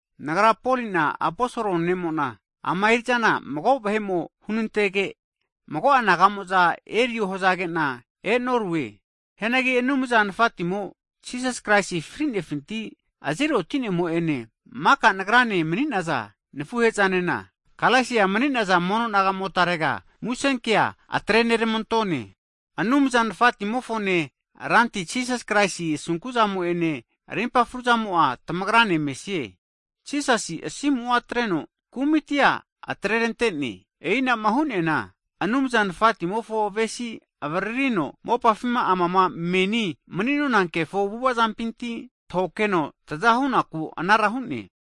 Nagra Poli'na aposol ne'mo'na, ama eri'zana mago'a vahe'mo hunantege, mago'a naga'mo'za erio hazagena e'norue. Hianagi Anumza Nafatimo Jisas Kraisi fri'nefinti azeri otinemo'ene, maka nagrane mni'naza nafuhezanena, Galesia mani'naza mono nagamotarega musenkea atreneramantone. Anumza Nafatimofone Ranti Jisas Kraisi asunkuzamo'ene rimpa fruzamo'a tamagrane mesie. Jisasi asimu'a atreno kumitia atrerante'ne. E'inama hu'neana Anumza Nafatimofo avesi avaririno, mopafima amama meni mni'nona kefo avu'avazampinti tahokeno tazahunaku anara hu'ne.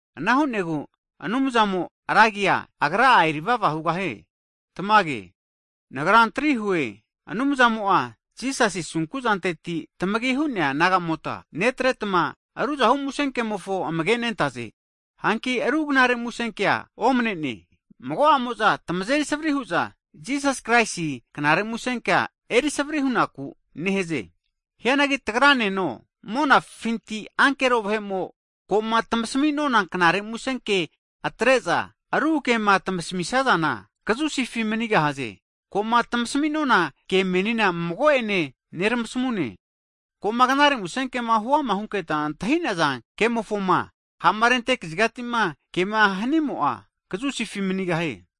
Ana hu'negu Anumzamo ra agia, Agra'a eri vava hugahie! Tamage. Nagra antri hue, Anumzamo'a Jisasi asunkuzanteti tamagi hu'nea nagamota netretma, ruzahu musenkemofo amage nentaze. Hanki ru knare musenkea omnene, mago'amo'za tmazeri savri hu'za Jisas Kraisi knare musenkea erisavri hunaku nehaze. Hianagi tagraneno, monafinti ankero vahe'mo, ko'ma tamasmi'nona knare musenke atre'za, ru kema tmasamisazana, kazusifi manigahaze! Ko'ma tmasmi'nona ke menina mago'ene neramasamue, Ko'ma knare musenkema huama hunketa antahi'naza kemofoma ha'ma rente kazigatima kema hanimo'a, kazusifi manigahie!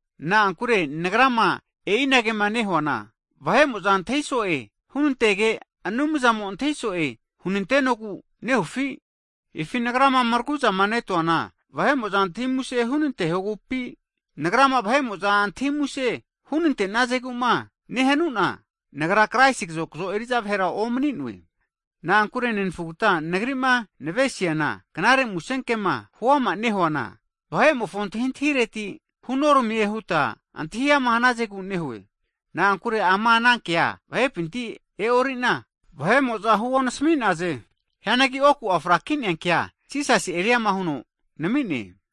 Na'ankure nagrama e'inagema nehuana, vahe'mo'za antahi so'e hunantege, Anumzamo antahi so'e hunantenogu nehufi? Hifi nagrama mraguzamanetuana vahe'mo'za antahi muse hunantehogupi? Nagrama vahe'mo'za antahi muse hunante'nazegu'ma nehanuna, Nagra Kraisi kazokzo eri'za vahera omni'noe. Na'ankure nenafugata nagri'ma navesiana, knare musenkema huama nehuana, vahe'mofo antahintahireti hunoramie huta antahi ama hnazegu nehue. Na'ankure ama ana kea vahepinti e'orina, vahe'mo'za rempia huonami'naze. Hianagi oku'a frakinea kea Jisasi eriama huno nami'ne.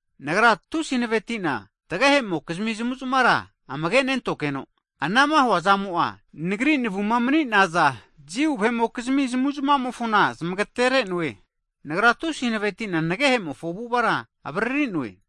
Nagra tusi hanaveti'na tagehe'mokizmi zamuzmara amage'nentogeno, anama huazamo'a nagri navuma mni'naza, Jiu vahe'mokizmia zamuzmamofona zmagatere'noe. Nagra tusi hanavetina nagehemofo avu'avara avaririnoe.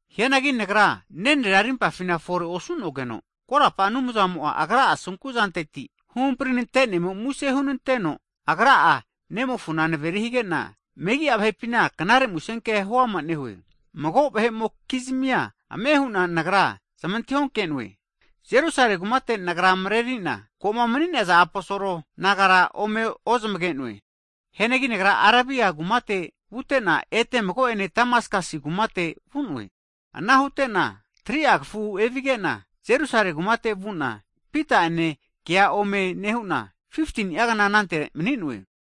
Hianagi nagra nenrera rimpafina forera osu'nogeno, korapa Anumzamo Agra'a asunkuzanteti huhamprinantenemo muse hunanteno, Agra'a nemofona naveri hige'na, megi'a vahepina knare musenkea huama nehue. Mago vahe'mokizmia ame hu'na nagra zmantahi'onke'noe. Jerusale kumate nagra mareorina, ko'ma mni'naza aposol nagara ome ozmage'noe. Hianagi nagra Arabia kumate vute'na, ete mago'ene Damasakas kumate vu'noe. Ana hute'na, 3'a kafu evige'na, Jerusale kumate vu'na, Pita'ene kea ome nehu'na, 15ni'agna anante mni'noe.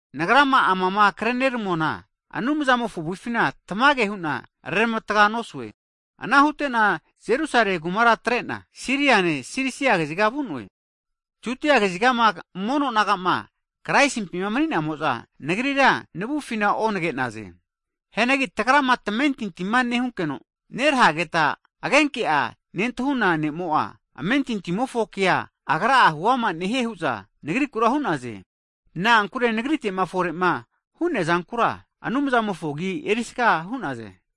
Nagrama amama kreneramuana, Anumzamofo avufina tamage hu'na reramatga nosue. Ana hute'na Jerusale kumara atre'na Siriane, Silisia kaziga vu'noe. Judia kazigama mono nagama Kraisimpi mni'namo'za, nagrira navufina onage'naze. Hianagi tagrama tamentintima nehunkeno, nerahegeta agenke'a nentahuna ne'mo'a, amentintimofo kea huama nehie hu'za nagrikura hu'naze. Na'ankure nagrite'ma fore'ma hu'neazankura, Anumzamofo agi erisaga hu'naze.